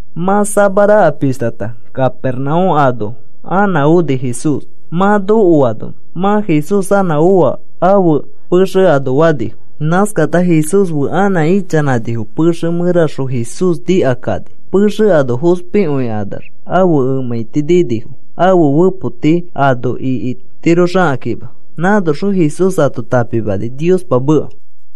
Mã samaraka pishtata Capernaúm ano anã oni Jesús. Mã nokoano, “Mã Jesús anã oa ãfe pexe ano,” fanifo. Nãskakata Jesús fe anã ichanãnifo pexe mẽraxõ. Jesús nikakani. Pexe ano fospikõikanax ãfe emãiti ninifo ãfe fepoti ano ikitiroxakãkima. Nãnoxõ Jesús ato tãpimani Niospa meka.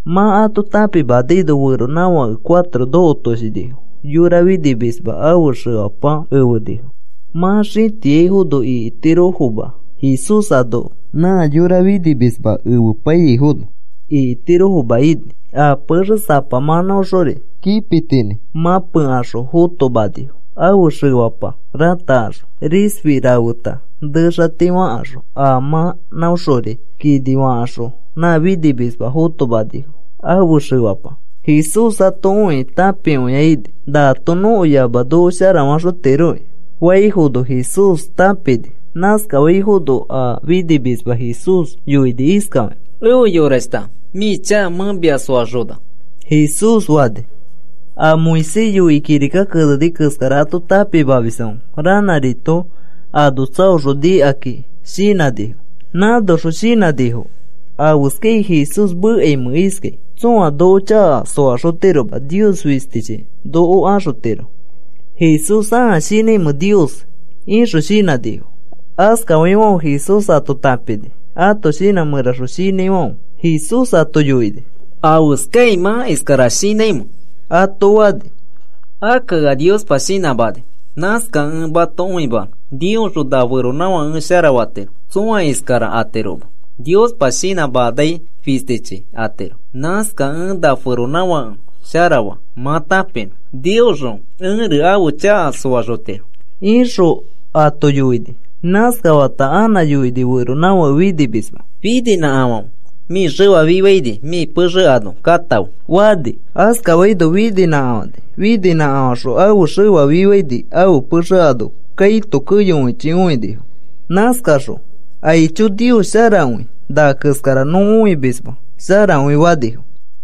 Mã ato tãpimanaino feronãfake cuatro nokotoshinifo. Yora finimisma ãfe xefapa efenifo. Mã xĩtiafono ikitirofoma, Jesús ano nã yora finimisma efepaiyaifono ikitirofoma ini. A pexe sapa mãnãoxori paitinĩ mãpekaxõ fotomanifo ãfe xefapa ratakaxõ. Risfi rafeta nexati fãkaxõ a mãnãoxori kini fakaxõ, nã finimisma fotomanifo, ãfe xefapa. Jesús ato õikĩ tãpikõia ini. “Naato nõko yama noko sharafaxotiroki,” faifono Jesús tãpini. Nãskafaifono a finimisma Jesús yoini iskafakĩ: “Efe yorashta, mĩ chaka mẽ mia soaxona,” Jesús fani. A Moisés yoikĩ kirika keneni keskara ato tãpimamisfãfe ranãrito ano tsaoxõ nikakĩ shinãnifo. Nãnoxõ shinãnifo: “¿Afeskai Jesús mekaimẽ iskai? Tsõa noko chaka soaxotiroma. Nios fistichi noko axotiro. ¿Jesús ãa shinãimẽ Nios?” ixõ shinãnifo. Askafaifãfe Jesús ato tãpini ãto shinã mẽraxõ shinãifãfe. Jesús ato yoini: “¿Afeskai mã iskara shinãimẽ?” ato fani. “Akka ea Niospa shinãmani. Nãskakẽ ẽ mato õimanõ Niosxõ na feronãfake ẽ sharafatiro. Tsõa iskara atiroma, Niospa shinãmanai fistichi atiro. Nãskakẽ ẽ na feronãfake sharafa mã tãpinõ Niosxõ ẽri ãfe chaka soaxotiro,” ixõ ato yoini. Nãskafata anã yoini feronãfake finimisma, “Fininãkafãfe. Mĩ xefa fifaini, mĩ pexe ano katãfe,” fani. Askafaino fininãkafani. Fininãkafaxõ ãfe xefa fifaini, ãfe pexe ano kaito keyokõichi õinifo. Nãskakaxõ, “¡Aicho, Nios sharakõi! Na keskara nõ õimisma, sharakõi,” fanifo.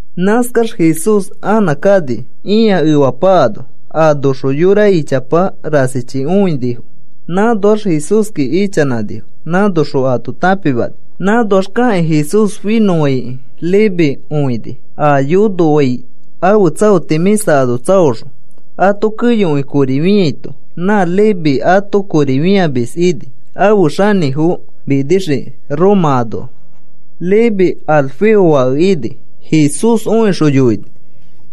Nãskax Jesús anã kani ĩa efapa ano. Anoxõ yora ichapa rasichi õinifo. Nãnoax Jesúski ichanãnifo. Nãnoxõ ato tãpimani. Nãnoax kakĩ Jesús finõfãikĩ Leví õini, a yonoai ãfe tsaoti mĩsa ano tsaoxõ, ato keyokõi kori fĩaito. Nã Leví ãto kori fĩamis ini ãfe xanĩfo minixiki Roma anoa. Leví Alfeo fake ini. Jesús õixõ yoini: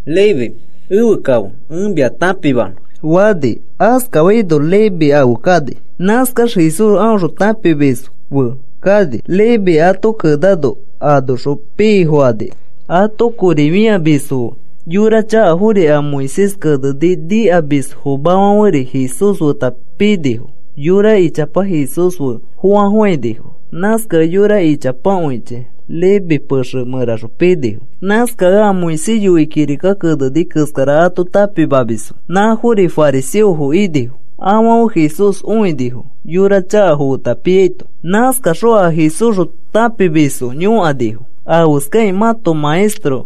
“Leví, efe kafe ẽ mia tãpimanõ,” fani. Askafaino Leví afe kani. Nãskax Jesús aõxõ tãpimisfo fe kani Leví ato kenano a anoxõ pii fokani. Ato kori fĩamisfo fe yora chakafori a Moisés keneni nikamisfomafãferi Jesús feta pinifo. Yora ichapa Jesús fe foafofãinifo. Nãskakẽ yora ichapakõichi Leví pexe mẽraxõ pinifo. Nãskakẽ a Moisés yoikĩ kirika keneni keskara ato tãpimamisfo nãfori fariseofo inifo. Afãfe Jesús õinifo yora chakafo feta piaito. Nãskaxõ a Jesúsxõ tãpimisfo yõkanifo: “¿Afeskakĩ mãto maestro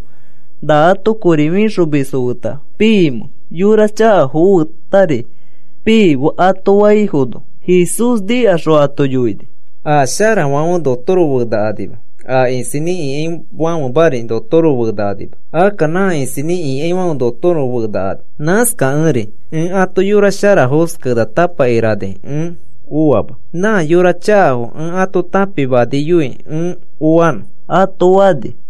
na ato kori fĩxomisfo feta piimẽ? Yora chakafo fetari pii,” ato faifono, Jesús nikaxõ ato yoini: “A sharafãfe notoro fenakanima, a isinĩ ikaifãfemari notoro fenakanima. Akka nã isinĩ ikaifãfe notoro fenakani. Nãskakẽri ẽ ato yora sharafos kenatapa ikerani ẽ oama. Nã yora chakafo ẽ ato tãpimaniyoi ẽ oanõ,” ato fani.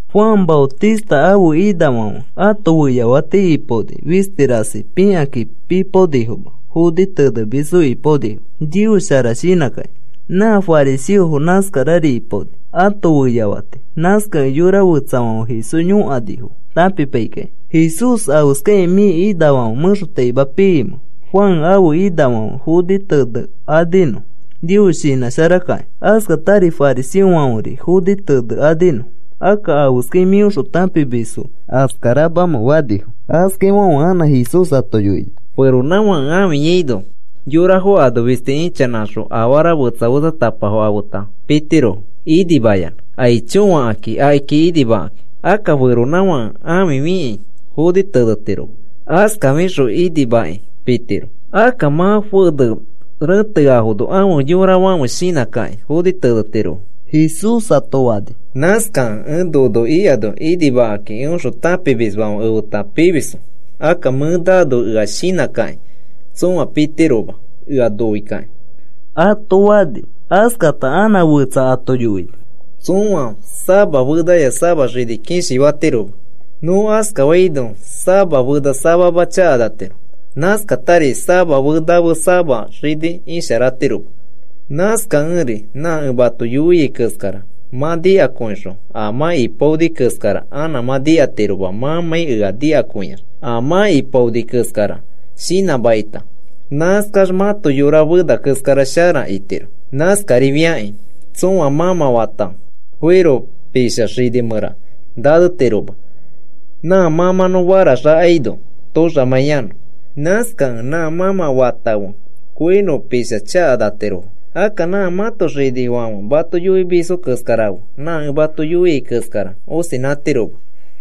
Juan Maotista ãfe inafãfe ãto feyafati ipaoni fisti rasi pikakĩ pipaonifoma foni tenemisfo ipaonifo Nios shara shinãkakĩ. Nã fariseofo nãskarari ipaoni ãto feyafati. Nãskakẽ yora fetsafãfe Jesús yõkanifo tãpipaikakĩ, “Jesús, ¿afeskakĩ mĩ inafãfe mẽxotaima piimẽ? Juan ãfe inafãfe foni tenekaninõ Nios shinãsharakakĩ. Askatari fariseofãferi foni tenekaninõ. Akka, ¿afeskai mĩõxõ tãpimisfo askaramamẽ?” fanifo. Askafaifãfe anã Jesús ato yoini: “Feronãfake ãfiyaino, yorafo ano fisti ichanãkaxõ afara fetsa fetsatapafo afeta pitirofo inimayanã, aicho fakakĩ akiki inimakakĩ. Akka feronãfãke ãfi fikĩ foni tenetiroma. Askafixõ inimakĩ pitiro. Akka mã fene rẽteafono ãfe yorafãfe shinãkakĩ foni tenetirofo,” Jesús ato fani. (“Nãskakẽ ẽ nono ikano inimakĩ eõxõ tãpimisfãfe efeta pimisfo. Akka mẽ naano ea shinãkakĩ tsõa pitiroma eõ noikakĩ,” ato fani.) Askata anã fetsa ato yoini: “Tsõa sama fenaya sama xini kishi fatiroma. Nõ askafaino sama fena samama chakanatiro. Nãskatari sama fenafe sama xini isharatiroma. Nãskakẽri nã ẽ mato yoiai keskara mã nikakõixõ a mã ipaoni keskara anã mã itiroma mãmãi ea nikakõiax. A mã ipaoni keskara shinãmakita nãskax mãto yora fena keskara shara itiro. Nãskarifakĩ tsõa mãmã fata koiro pisha xini mẽra nanetiroma nã mãmãnõ faraxakaino toxamãiyanõ. Nãskakẽ nã mãmã fata fe koiro pisha chakanatirofo. Akka nã mãto xinifãfe mato yoimisfo keskara fe nã ẽ mato yoiai keskara osinãtiroma.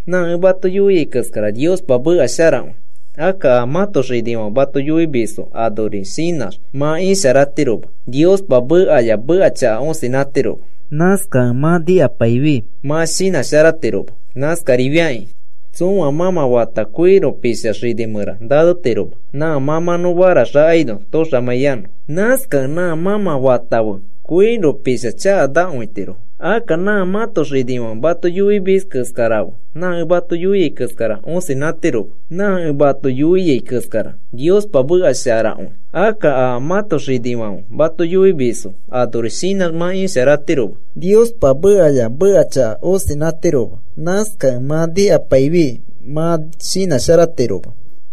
Nã ẽ mato yoiai keskara Niospa meka sharakõi. Akka a mãto xinifãfe mato yoimisfo anori shinãx mã isharatiroma. Niospa mekaya meka chaka osinãtiroma. Nãskakẽ mã nikapaifi mã shinãsharatiroma. Nãskarifakĩ tsõa mãmã fata koiro pisha xini mẽra nanetiroma nã mãmãnõ faraxakaino toxamãiyanõ. Nãskakẽ nã mãmã fata fe koiro pisha chakanatirofo. Akka nã mãto xinifãfe mato yoimisfo keskarafe nã ẽ mato yoiai keskara osinãtiroma. Nã ẽ mato yoiai keskara Niospa meka sharakõi. Akka a mãto xinifãfe mato yoimisfo anori shinãx mã isharatiroma. Niospa mekaya meka chaka osinãtiroma. Nãskakẽ mã nikapaifi mã shinãsharatiroma.”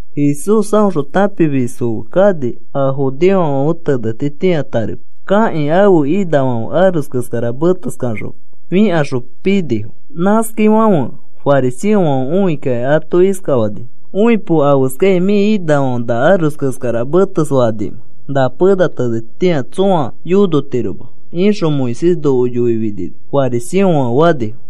Jesús aõxõ tãpimisfo fe kani a judeofãfe tenetitĩa. Tarepa kakĩ ãfe inafãfe aros keskara meteskaxõ fikaxõ pinifo. Nãskafaifãfe fariseofãfe õikakĩ ato iskafanifo: “Õipo. ¿Afeskakĩ mĩ inafãfe na aros keskara metesfekanimẽ na pena tenetitĩa tsõa yonotiroma ixõ Moisés noko yoifinino?” fariseofãfe fanifo.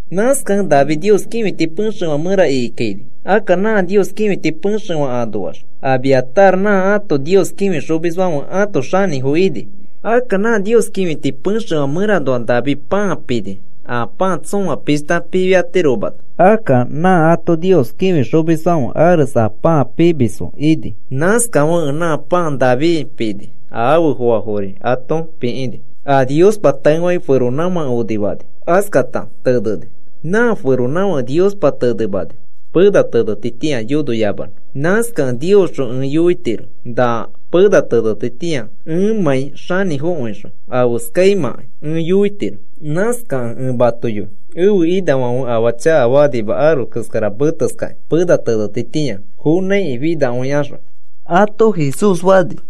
Nãskakẽ David Nios kĩfiti pexefã mẽra ikikaini. Akka nã Nios kĩfiti pexefã anoax Abiatar nã ato Nios kĩfixomisfãfe ãto xanĩfo ini. Akka nã Nios kĩfiti pexefã mẽranoa David pãa pini a pãa tsõa pishta pifiatiromano. Akka nã ato Nios kĩfixomisfãfe arese a pãa pimisfo ini. Nãskafekẽ nã pãa David pini a afe foafori ato pikĩni. “A Niospa taefakĩ feronãfake onifani. Askata teneni. Nã feronãfake Niospa tenemani, pena tenetitĩa yonoyamanõ. Nãskakẽ Niosxõ ẽ yoitiro na pena tenetitĩa ẽmãi xanĩfokõixõ afeskaimãkai ẽ yoitiro. Nãskakẽ ẽ mato yoi ẽfe inafãfe afaa chakafakanima aros keskara meteskakĩ pena tenetitĩa fonãiki finakõikaxõ,” ato Jesús fani.